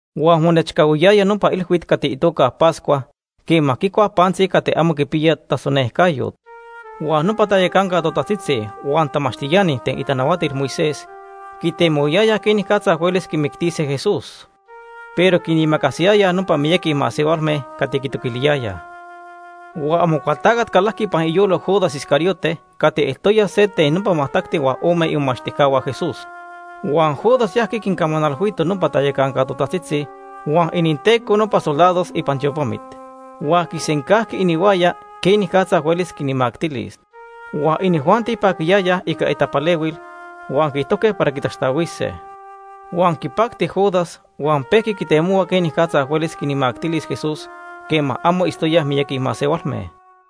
Huan monechcahuiyaya nopa ilhuit cati itoca Pascua quema quicuaj pantzi cati amo quipiya tasonejcayot. Huan nopa tayacanca totajtzitzi huan tamachtiani ten itanahuatil Moisés quitemohuayayaj quenicatza huelis quimictise Jesús, pero quinimacasiyayaj nopa miyaqui masehualme cati quitoquiliyayaj. Huan Amocualtacat calajqui ipan iyolo Judas Iscariote cati eltoya se ten nopa majtacti huan ome imomachtijcahua Jesús. Huan Judas yajqui quincamanalhuito nopa tayacanca totajtzitzi huan ininteco nopa soldados ipan tiopamit, huan quisencajqui inihuaya quenicatza huelis quinmactilis. Huan inijuanti paquiyayaj ica itapalehuil huan quiijtojque para quitaxtahuise. Huan quipacti Judas huan pejqui quitemohua quenicatza huelis quinmactilis Jesús quema amo itztoyaj miyaqui masehualme.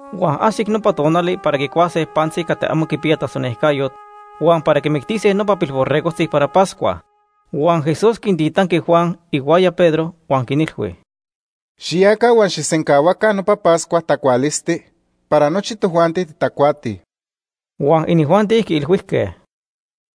Huan ajsic nopa tonali para quicuase pantzi cati amo quipiya tasonejcayot, huan para quimictise nopa pilborregojtzi para Pascua. Huan Jesús quintitanqui Juan ihuaya Pedro huan quinilhui: ―Xiyaca huan xijsencahuaca nopa Pascua tacualisti para nochi tojuanti titacuatij. Huan inijuanti quiilhuijque: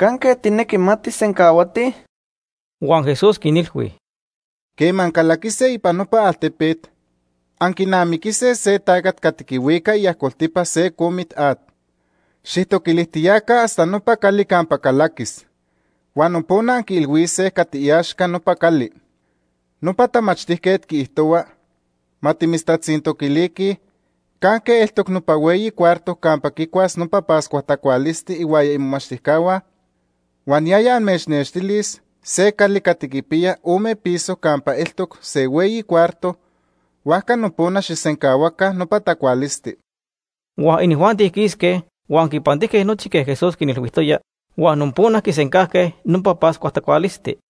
―¿Canque tijnequi ma tijsencahuatij? Huan Jesús quinilhui: ―Quema ancalaquise ipan nopa altepet, anquinamiquise se tacat cati quihuica iajcoltipa se comit at. Xijtoquilijtiyaca hasta nopa cali campa calaquis. Huan nopona anquiilhuise cati iaxca nopa cali: ‘Nopa tamachtijquet quiijtohua ma timitztatzintoquiliquij, ¿canque eltoc nopa hueyi cuarto campa quicuas nopa Pascua tacualisti ihuaya imomachtijcahua?’ Huan yaya amechnextilis se cali cati quipiya ome piso campa eltoc se hueyi cuarto, huajca nopona xijsencahuaca nopa tacualisti. Huan inijuanti quisque huan quipantijque nochi quej Jesús quinilhuijtoya huan nopona quisencajque nopa Pascua tacualisti.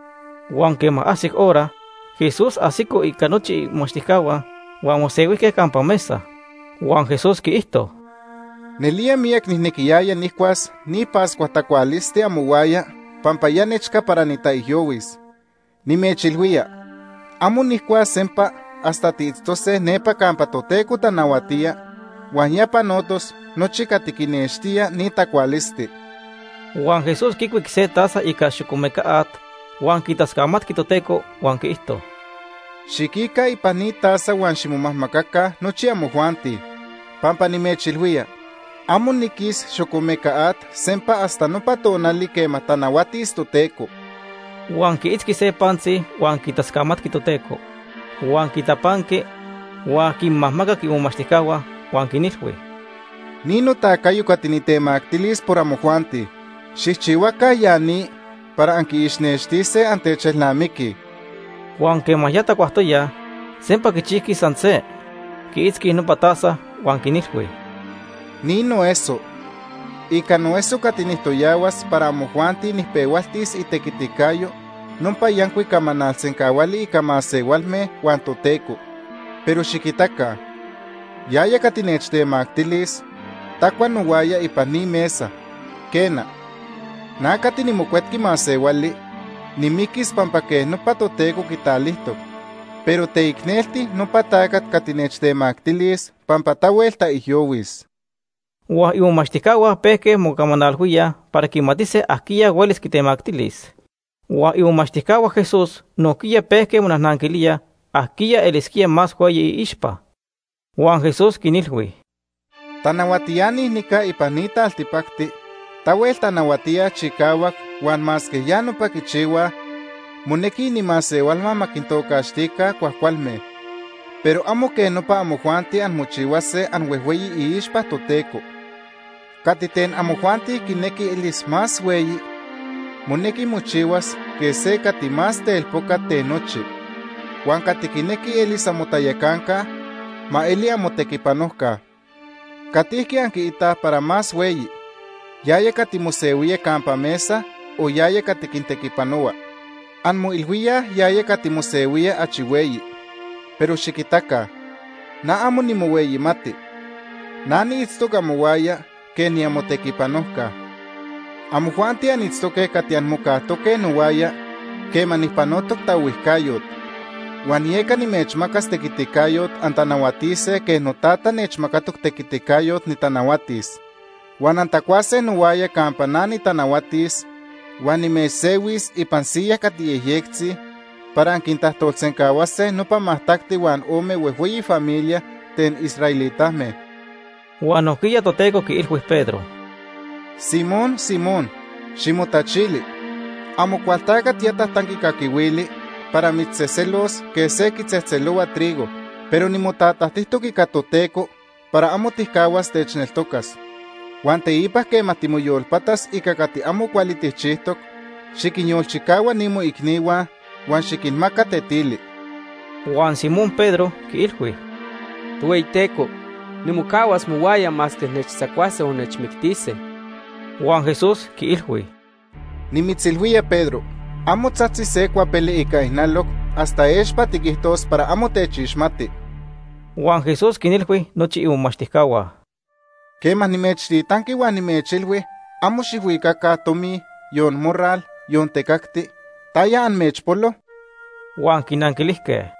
Huan quema ajsic hora, Jesús ajsico ica nochi imomachtijcahua huan mosehuijque campa mesa. Huan Jesús quiijto: ―Nelía miyac nijnequiyaya nijcuas ni Pascua tacualisti amohuaya pampa ya nechca para nitaijyohuis. Nimechilhuía, amo nijcuas sempa hasta tiitztose nepa campa Toteco tanahuatía huan ya panotos nochi cati quinextía ni tacualisti. Huan Jesús quicuic se taza ica xocomeca at huan quitascamatqui Toteco huan quiijto: ―Xiquica ipan ni taza huan ximomajmacaca nochi amojuanti. Pampa nimechilhuía, amo niquis xocomeca at sempa hasta nopa tonali quema tanahuatis Toteco. Huan quiitzqui se pantzi huan quitascamatqui Toteco. Huan quitapanqui huan quinmajmacac imomachtijcahua huan quinilhui: ―Ni notacayo cati nitemactilis por amojuanti. Xijchihuaca ya ni para anquiixnextise annechelnamiquij. Huan quema ya tacuajtoyaj, sempa quichijqui san se, quiitzqui nopa taza, huan quinilhui: ―Ni noeso. Ica noeso cati nijtoyahuas para amojuanti nijpehualtis itequiticayo nopa yancuic camanal sencahuali ica masehualme huan Toteco. Pero xiquitaca, yaya cati nechtemactilis tacua nohuaya ipan ni mesa. Quena, na cati niMocuetqui Masehuali nimiquis pampa quej nopa Toteco quitalijtoc, pero teicnelti nopa tacat cati nechtemactilis pampa tahuel taijyohuis. Huan imomachtijcahua pejque mocamanalhuíaj para quimatise ajquiya huelis quitemactilis. Huan imomachtijcahua Jesús nojquiya pejque monajnanquilíaj ajquiya elisquía más hueyi iixpa. Huan Jesús quinilhui: “Tanahuatiani nica ipan ni taltipacti tahuel tanahuatíaj chicahuac huan masque ya nopa quichihuaj monequi inimasehualhua ma quintocaxtica ‘cuajcualme’. Pero amo quej nopa amojuanti anmochihuase anhuejhueyi iixpa Toteco. Cati ten amojuanti quinequi elis más hueyi, monequi mochihuas quej se cati más telpocat ten nochi. Huan cati quinequi elis amotayacanca, ma eli amotequipanojca. ¿Catijqui anquiitaj para más hueyi, yaya cati mosehuía campa mesa o yaya cati quintequipanohua? Anmoilhuíaj yaya cati mosehuía achi hueyi. Pero xiquitaca na amo nimohueyimati. Na niitztoc amohuaya quej niamotequipanojca. “Amojuanti anitztoque cati anmocajtoque nohuaya quema nijpanotoc taohuijcayot. Huan yeca nimechmacas tequiticayot antanahuatise quej noTata nechmacatoc tequiticayot nitanahuatis. Huan antacuase nohuaya campa na nitanahuatis, huan nimechsehuis ipan siyas cati yejyectzi para anquintajtolsencahuase nopa majtacti huan ome huejhueyi familias ten israelitame.” Huan nojquiya Toteco quiilhui Pedro: ―Simón, Simón, ximotachili. Amocualtacat ya tajtanqui caquihuili para mitztzejtzelos quej se quitzejtzelohua trigo, pero nimotatajtijtoc ica Toteco para amo tijcahuas techneltocas. Huan teipa quema timoyolpatas ica cati amo cuali tijchijtoc, xiquinyolchicahua ni moicnihua, huan xiquinmaca tetili. Huan Simón Pedro quiilhui: ―Tohueyiteco, nimocahuas mohuaya masque nechtzacuase o nechmictise. Huan Jesús quiilhui: ―Nimitzilhuía Pedro, amo tzajtzis se cuapele ica ijnaloc hasta expa tiquijtos para amo techixmati. Huan Jesús quinilhui nochi imomachtijcahua: ―Quema nimechtitanqui huan nimechilhui amo xijhuicaca tomi, yon morral, yon tecacti, ¿taya amechpolo? Huan quinanquilijque: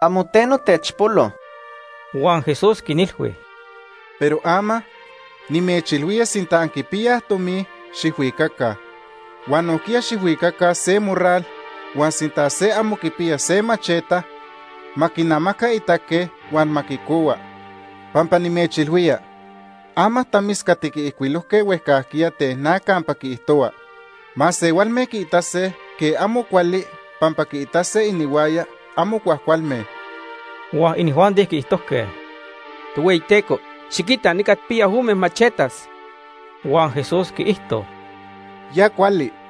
―Amo teno techpolo. Huan Jesús quinilhui: ―Pero ama, nimechilhuía sinta anquipiyaj tomi, xijhuicaca. Huan nojquiya xijhuicaca se morral, huan sinta se amo quipiya se macheta, ma quinamaca itaque huan ma quicohua. Pampa nimechilhuía, ama tamis cati quiijcuilojque huejcajquiya ten na campa quiijtohua: ‘Masehualme quiitase quej amo cuali pampa quiitase inihuaya amo cuajcualme.’ Huan inijuanti quiijtojque: ―Tohueyiteco, xiquita nica tijpiyaj ome machetas. Huan Jesús quiijto: ―Ya cuali.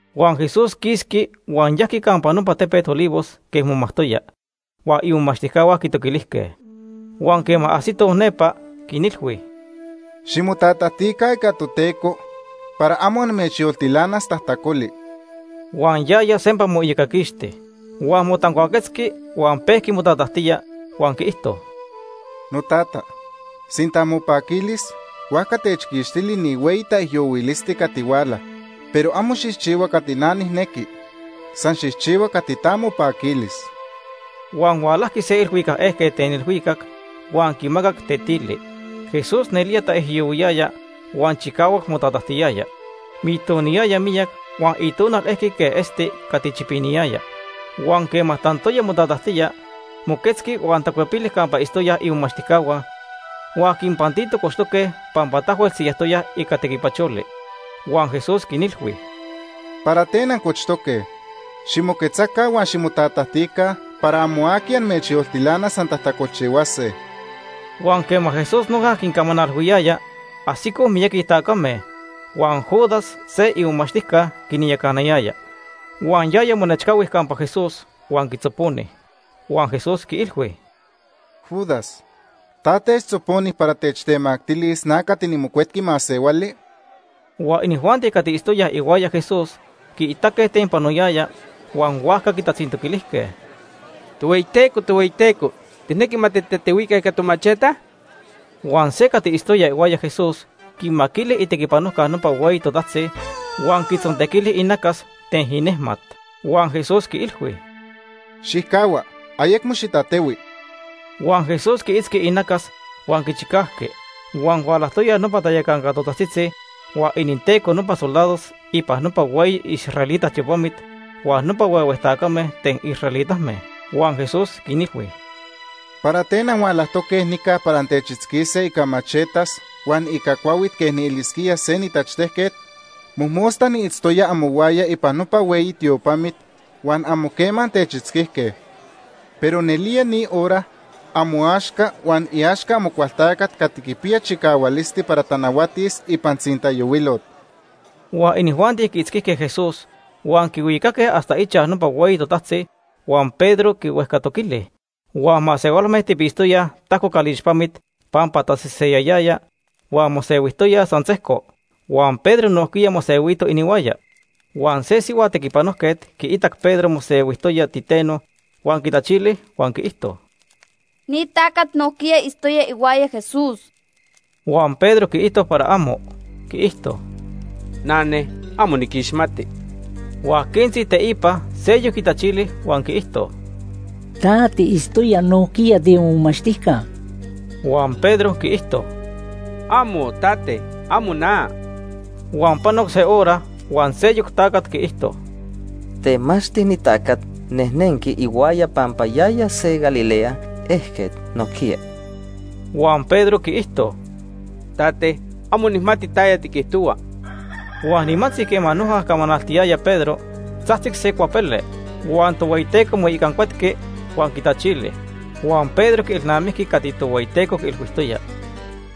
Huan Jesús quisqui huan yajqui campa nopa tepet Olivos quej momajtoya, huan imomachtijcahua quitoquilijque. Huan quema ajsitoj nepa, quinilhui: ―Ximotatajtica ica Toteco para amo amechyoltilanas tajtacoli. Huan yaya sempa moiyocaquixti. Huan motancuaquetzqui huan pejqui motatajtía, huan quiijto: “Notata, sinta mopaquilis, huajca techquixtili ni hueyi taijyohuilisti cati huala, pero amo xijchihua cati na nijnequi, san xijchihua cati ta mopaquilis.” Huan hualajqui se ilhuicac ejquet ten ilhuicac huan quimacac tetili. Jesús nelía taijyohuiyaya, huan chicahuac motatajtiyaya. Mitoniyaya miyac huan iitonal elqui quej esti cati chipiniyaya. Huan quema tantoya motatajtía, moquetzqui huan tacuepili campa itztoyaj imomachtijcahua, huan quinpantito cochtoque pampa tahuel siyajtoyaj ica tequipacholi. Huan Jesús quinilhui: ―¿Para ten ancochtoque? Ximoquetzaca huan ximotatajtica para amo aqui amechyoltilanas antajtacolchihuase. Huan quema Jesús noja quincamanalhuiyaya, ajsicoj miyaqui tacame. Huan Judas se imomachtijca quinyacanayaya. Huan yaya monechcahui campa Jesús huan quitzoponi. Huan Jesús quiilhui: ―Judas, ¿ta techtzoponi para techtemactilis na cati niMocuetqui Masehuali? Huan inijuanti cati itztoyaj ihuaya Jesús quiitaque ten panoyaya, huan huajca quitatzintoquilijque: ―Tohueyiteco, Tohueyiteco, ¿tijnequi ma titatehuica ica tomacheta? Huan se cati itztoya ihuaya Jesús, quimaquili itequipanojca nopa hueyi totajtzi huan quitzontequili inacas ten inejmat. Huan Jesús quiilhui: ―¡Xijcahua! Ayecmo xitatehui. Huan Jesús quiitzqui inacas huan quichicajqui. Huan hualajtoyaj nopa tayacanca totajtzitzi huan ininteco nopa soldados ipan nopa hueyi israelita tiopamit huan nopa huehue tacame ten israelitame. Huan Jesús quinilhui: ―¿Para ten anhualajtoque nica para antechitzquise ica machetas huan ica cuahuit quej nielisquía se nitachtejquet? Mojmosta niitztoya amohuaya ipan nopa hueyi tiopamit, huan amo quema antechitzquijque. Pero nelía ni hora amoaxca huan iaxca Amocualtacat cati quipiya chicahualisti para tanahuatis ipan tzintayohuilot. Huan inijuanti quiitzquijque Jesús, huan quihuicaque hasta ichaj nopa hueyi totajtzi huan Pedro quihuejcatoquili. Huan masehualme tipitztoyaj tajco calixpamit pampa taseseyayaya huan mosehuijtoyaj san sejco, huan Pedro nojquiya mosehuito inihuaya. Huan se sihua tequipanojquet quiitac Pedro mosehuiyaya titeno huan quitachili huan quiijto: ―Ni tacat nojquiya itztoya ihuaya Jesús. Huan Pedro quiijto para amo. Quiijto: ―Nane, amo niquixmati. Huan quentzi teipa seyoc quitachili huan quiijto: ―Ta tiitztoya nojquiya tiimomachtijca. Huan Pedro quiijto: ―¡Amo, Tate! ¡Amo na! Huan panoc se hora huan seyoc tacat quiijto: ―Temachti ni tacat nejnenqui ihuaya pampa yaya se Galilea ejquet nojquiya. Huan Pedro quiijto: ―Tate, amo nijmati taya tiquijtohua. Huan nimantzi quema noja camanaltiyaya Pedro, tzajtzic se cuapele. Huan Tohueyiteco moicancuetqui huan quitachili. Huan Pedro quielnamijqui cati Tohueyiteco quiilhuijtoya: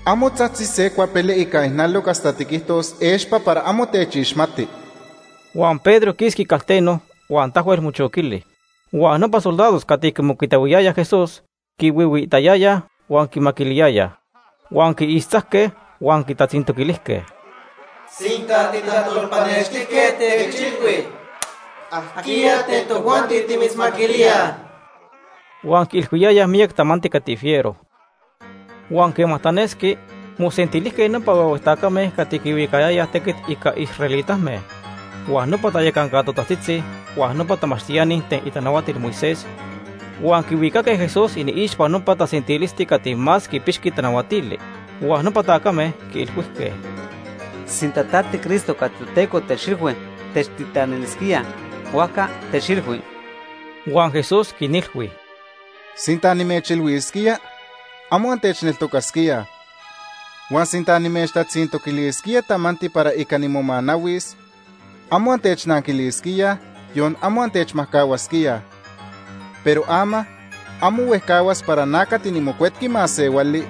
“Amo tzajtzis se cuapele ica ijnaloc hasta tiquijtos expa para amo techixmati.” Huan Pedro quisqui calteno huan tahuel mochoquili. Huan nopa soldados cati quimocuitahuiyayaj Jesús quihuihuiitayayaj huan quimaquiliyayaj. Huan quiixtzajque huan quitatzintoquilijque: ―Sinta titajtolpanextijquet, techilhui, ¿ajquiya ten tojuanti timitzmaquilíaj? Huan quiilhuiyayaj miyac tamanti cati fiero. Huan quema tanesqui, mosentilijque nopa huehue tacame cati quihuicayayaj tequit ica israelitame, huan nopa tayacanca totajtzitzi, huan nopa tamachtiani ten itanahuatil Moisés, huan quihuicaque Jesús iniixpa nopa tasentilisti cati más quipixqui tanahuatili. Huan nopa tacame quiilhuijque: ―Sinta ta tiCristo cati Toteco techilhui techtitanilisquía, huajca techilhui. Huan Jesús quinilhui: ―Sinta nimechilhuisquía, amo antechneltocasquíaj. Huan sinta nimechtatzintoquilisquía tamanti para ica nimomanahuis, amo antechnanquilisquíaj, yon amo antechmajcahuasquíaj. Pero ama, amo huejcahuas para na cati niMocuetqui Masehuali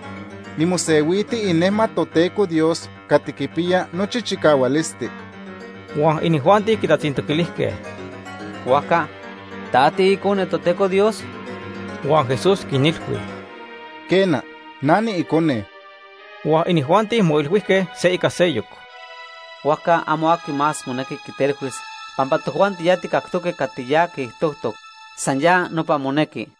nimosehuiti inejmat Toteco Dios cati quipiya nochi chicahualisti. Huan inijuanti quitatzintoquilijque: ―Huajca ¿ta tiIcone Toteco Dios? Huan Jesús quinilhui: ―Quena, na niIcone. Huan inijuanti moilhuijque se ica seyoc: ―Huajca amo aqui más monequi quitelhuis, pampa tojuanti ya tijcactoque cati ya quiijtojtoc. San ya nopa monequi.